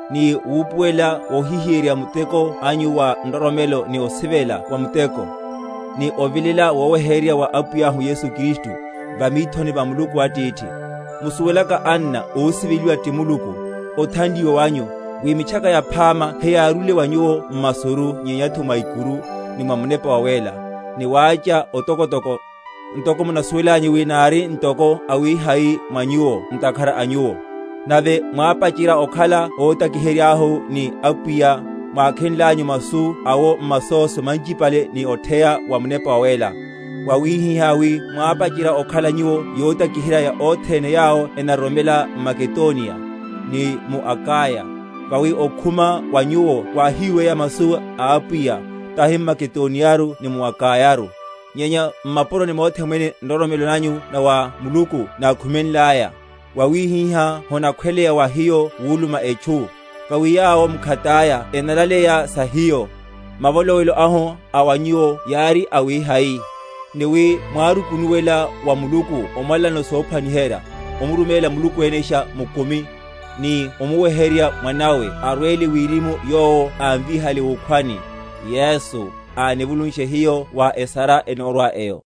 ni wupuwelela wohihiyeryerya muteko anyu wa nroromelo, ni osivela wa muteko, ni ovilela woweheryerya wa Apwiyahu Yesu Kristu, va mithoni va Muluku Atithihu; musuwelaka, anna ósiveliwa ti Muluku, othanliwa wanyu, wi Mitchaka Yaphama heyárúle wa nyuwo m’masuru, nyenyatho mwa ikuru, ni mwa Munepa Wawéla, ni wácha otokotoko; ntoko munasuwelanyu wi nári ntoko awihai mwa nyuwo ntakhara a nyuwo. Nave mwápacherya okhala óntakiheryáhu, ni a Apwiya, mwákhenlanyu masu awo m’masóso manchipale, ni otheya wa Munepa Wawéla; wawihihá wi mwápacherya okhala nyuwo yotakiherya wa othene yawo enaroromela m’Makedoniya, ni mu Akaya. Vawi okhuma wa nyuwo wáhiweya masu a Apwiya, tahi m’Makedoniyaru ni mu Akayaru, nyenya m’mapuroni mothe mwene nroromelo nanyu na wa Muluku nákhumenlaya; wawihihá honakhweleya wa hiyo wuluma etchu. Vawi yawo mkhataya enalaleya sa hiyo, mavolowelo ahu a wa nyuwo yári awihai; ni wi mwárukunuwela wa Muluku omwalanano sophwaniherya, omuruméla Muluku enesha mukumi, ni omuweherya Mwanáwe arwele wirimu, yowo ámvíhaliye wukhwani, Yesu, anivulushe hiyo wa esara enórwa eyo.